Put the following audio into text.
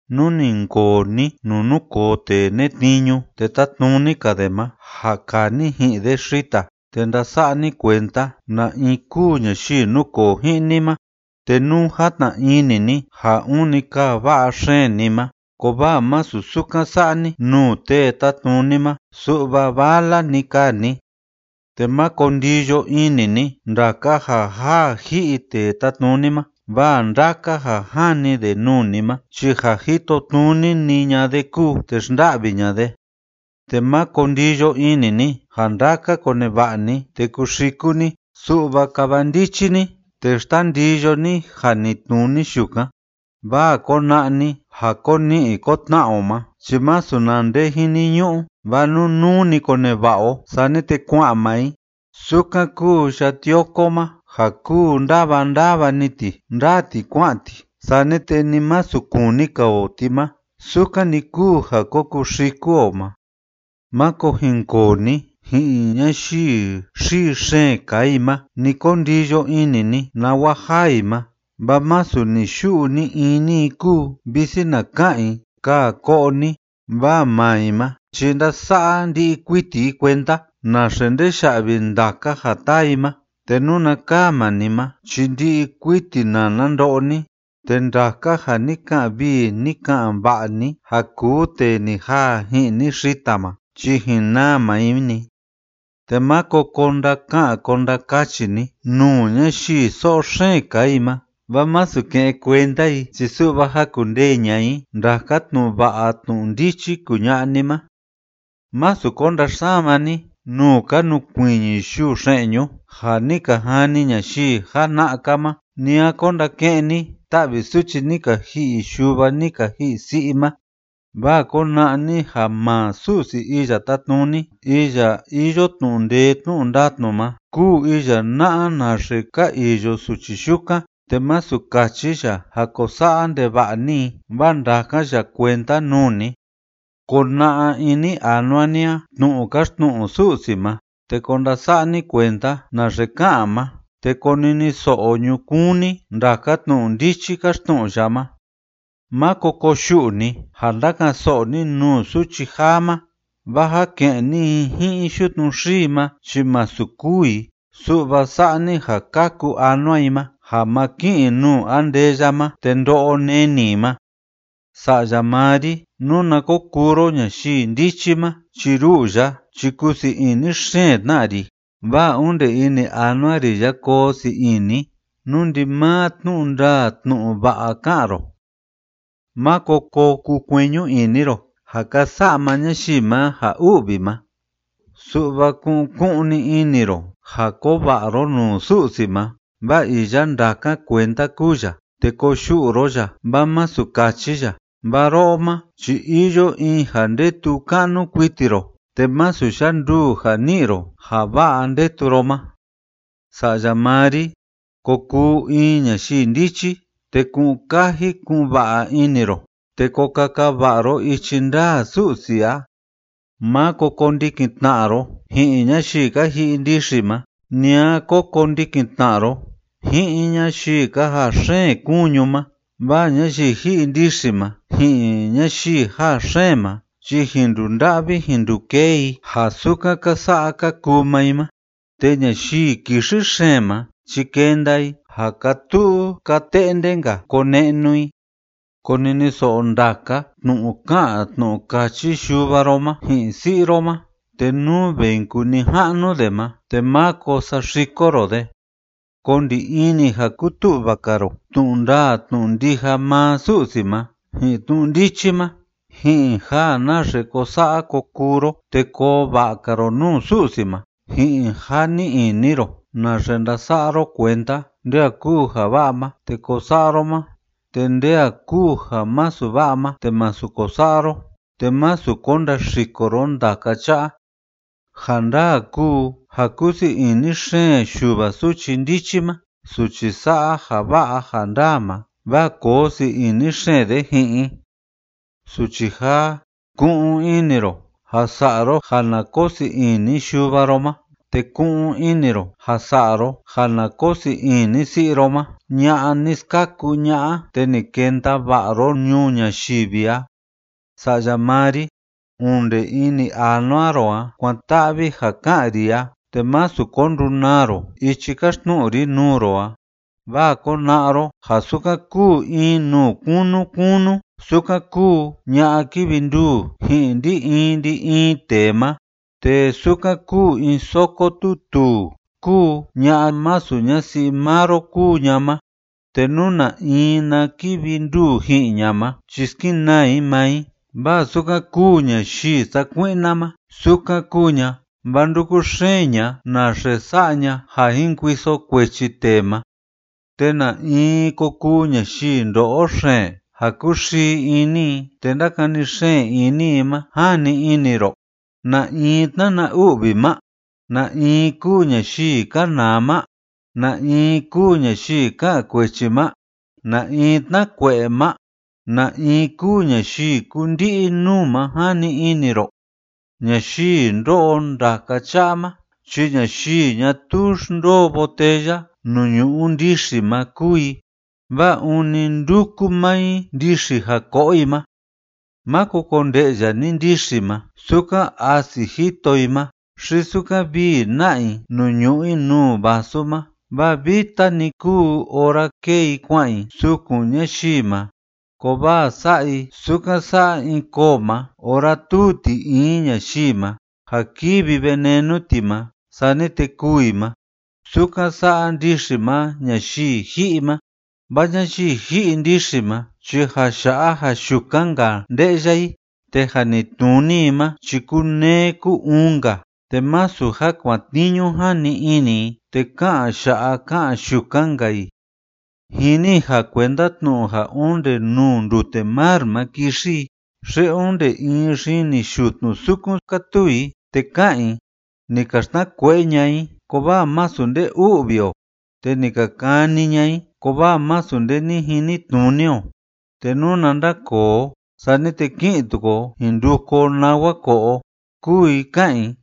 Nú ni jinkoo ni nuu núkoo tee netniñu te tátnuni‑ka de ma ja kaa ni ji'in de xita, te ndasa'a ni kuenda na in kúu ñayii núkoo ji'in ni ma. Te nú játna ini ni ja ûni kaa va'a xeen ni ma, kovaa masu sukan sa'a ni nuu tee tátnuni ma, su'va vala‑ni kaa ni. Te máko ndiyo ini ni ndaka ja jaa ji'i tee tátnuni ma, vaa ndaka ja jani de nuu ni ma chi ja jitotnuni‑ni ña'a de kúu te xnda'vi ña'a de. Te máko ndiyo ini ni ja ndaka koneva'a ni te kuxiku ni, su'va kava ndichi ni, te xtandiyo ni janitnuni yukan, vaa kona'a ni ja ko ni'i ko tna'a o ma chi masu na nde jiniñu'u, vaa nunuu‑ni koneva'a o sani te kua'an maa i. Sukan kuu ya'a tioko ma ja kúu ndáva ndáva‑ni ti ndáa ti kua'an ti sani te ni masu kuni‑ka o ti ma, sukan‑ni kúu ja ko kuxiku o ma. Máko jinkoo ni ji'in ñayii xii xeen kaa i ma, ni ko ndiyo ini ni nawa jaa i ma, vaa masu ni‑yu'u ni‑ini i kúu, visi na ka'an i: “Kaa ko'o ni”, vaa maa i ma chi ndása'a ndi'i kuiti i kuenda naxe ndeya'vi ndaka ja taa i ma, te nuna kaa maa ni ma chi ndi'i kuiti nana ndo'o ni, te ndaka ja ni ka'an vii ni ka'an va'a ni ja kuu tee ni jaa ji'in ni xita ma, chi jin naa maa i‑ni. Te máko ko ndaka'an ko ndakachi ni nuu ñayii so'o xeen kaa i ma, vaa masu ke'en kuenda i chi su'va jakundee ña'a i ndaka tnu'u va'a tnu'u ndichi kuña'a ni ma. Másu ko ndaxsama ni nuu ka nukuiñi yuu xe'ñu ja ni ka jani ñayii jana'a‑ka ma, ni a ko ndake'en ni ta'vi suchi ni ka ji'i yuva ni ka ji'i si'i ma, vaa kona'a ni ja maa Su'si Iya Tátnuni iya iyo tnu'u ndee tnu'u ndatnu ma kúu iya na'a naxe ka iyo suchi yukan, te masu kachi ya ja ko sa'a ndeva'a ni i, vaa ndakan ya kuenda nuu ni. Kona'a ini anua ni a tnu'u káxtnu'u Su'si ma, te ko ndasa'a ni kuenda naxe ká'an ma, te koniniso'o ñukuun ni ndaka tnu'u ndichi káxtnu'u ya ma. Máko koyu'u ni ja ndaka'an‑so'o ni nuu suchi jaa ma, vaa ja ke'en ni i ji'in yutnu xii ma chi masu kûu i, su'va sa'a ni ja kaku anua i ma ja ma ki'in i nuu andeya ma te ndo'o neni i ma. Sa'ya maa ri, nuna ko kuu ro ñayii ndichi ma chi ru'u ya chi kusii ini xeen tna ri, vaa onde ini anua ri a koo sii ini, nú ndimaa tnu'u ndaa tnu'u va'a ká'an ro. Máko ko kukueñu ini ro ja ka sa'a maa ñayii ma ja u'vi ma, su'va ku'un ku'un‑ni ini ro ja koo va'a ro nuu Su'si ma, vaa iya ndákan kuenda kúu ya, te koyu'u ro ya vaa masu kachi ya, vaa ro'o ma chi iyo in ja ndetu ka'nu kuiti ro, te masu yanduu ja ni'i ro ja va'a ndetu ro ma. Sa'ya maa ri, ko kuu in ñayii ndichi, te ku'un kaji ku'un va'a ini ro, te ko kaka va'a ro ichi ndaa Su'si a. Máko kondikin tna'a ro ji'in ñayii ka ji'i ndixi ma, ni a ko kondikin tna'a ro ji'in ñayii ka jaa xeen kuñu ma, vaa ñayii ji'i ndixi ma ji'in ñayii jaa xeen ma chi jin ndunda'vi jin ndukee i ja sukan ka sa'a ka kuu maa i ma, te ñayii kixi xeen ma chi kenda i ja kaa tu'u kaa te'nde‑nka kone'nu i. Koniniso'o ndaka tnu'u ká'an tnu'u káchi yuva ro ma ji'in si'i ro ma, te nú ve jin kuu nija'nu de ma te máko saxiko ro de. Ko ndi ini ja kutu'va‑ka ro tnu'u ndaa tnu'u ndija maa Su'si ma ji'in tnu'u ndichi ma ji'in ja naxe ko sa'a ko kuu ro te koo va'a‑ka ro nuu Su'si ma ji'in ja ni'i ini ro naxe ndasa'a ro kuenda nde a kúu ja va'a ma te ko sa'a ro ma te nde a kúu ja masu va'a ma te másu ko sa'a ro, te másu ko ndaxiko ro ndaka cha'a. Ja ndaa kúu ja kúsii ini xeen yuva suchi ndichi ma suchi sa'a ja va'a ja ndaa ma, vaa koo sii ini xeen de ji'in i. Suchi jaa, ku'un ini ro ja sa'a ro ja na koo sii ini yuva ro ma, te ku'un ini ro ja sa'a ro ja na koo sii ini si'i ro ma ña'a ni skaku ña'a te ni kenda va'a ro ñuu ñayivi a. Sa'ya maa ri, onde ini anua ro a kuan‑ta'vi ja ká'an ri a, te másu ko ndunaa ro ichi káxtnu'u ri nuu ro a, vaa kona'a ro ja sukan kúu in nuu kunu kunu, sukan kúu ña'a kívi nduu ji'in ndi‑in ndi‑in tee ma, te sukan kúu in soko tuu tuu kúu ña'a masu ñasi'i maa ro kúu ña ma, te nú na in na kivi nduu ji'in ña ma chi skenaa i maa i, vaa sukan kúu ñayii sakui'na ma sukan kúu ña, vaa ndúku xeen ña naxe sa'a ña ja jin kuiso kuechi tee ma. ¿Te na in ko kuu ñayii ndo'o xeen ja kúxii ini i te ndakani xeen ini i ma, jani ini ro? ¿Na in tnana u'vi ma? ¿Na in kúu ñayii kanaa ma? ¿Na in kúu ñayii ka'an kuechi ma? ¿Na in tnákue'e ma? ¿Na in kúu ñayii kúndi'i nuu ma, jani ini ro? Ñayii ndó'o ndaka cha'a ma chi ñayii ñatuu xndoo botella nuu ñu'u ndixi ma kúu i, vaa ûni ndúku maa i ndixi ja ko'o i ma. Máko konde'ya ni ndixi ma sukan asi jito i ma xi sukan vii na'a i nuu ñu'u i nuu vasu ma, vaa vita‑ni kúu ora kée i kua'an i sukun ñayii ma, kovaa sa'a i sukan sa'a in koo ma ora túu ti in ñayii ma ja kívi venenu ti ma sani te kûu i ma. Sukan sa'a ndixi ma ñayii ji'i ma, vaa ñayii ji'i ndixi ma chi ja ya'a ja yukan‑ka nde'ya i, te janitnuni i ma chi kúneé kú‑uun‑nka, te masu ja kuatniñu jani ini i te ká'an ya'a ká'an yukan‑nka i. Jini i ja kuenda tnu'u ja onde nuu ndute mar ma kixi i xi onde in xini yutnu sukun kátuu i, te ká'an i: “Ni ka xtnakue'e ña'a i, kovaa masu nde u'vi o, te ni ka kani ña'a i, kovaa masu nde ni jinitnuni o, te nuna ndakoo o, sani te ki'in tuku o jin nduku o nawa ko'o o”, kúu i ká'an i.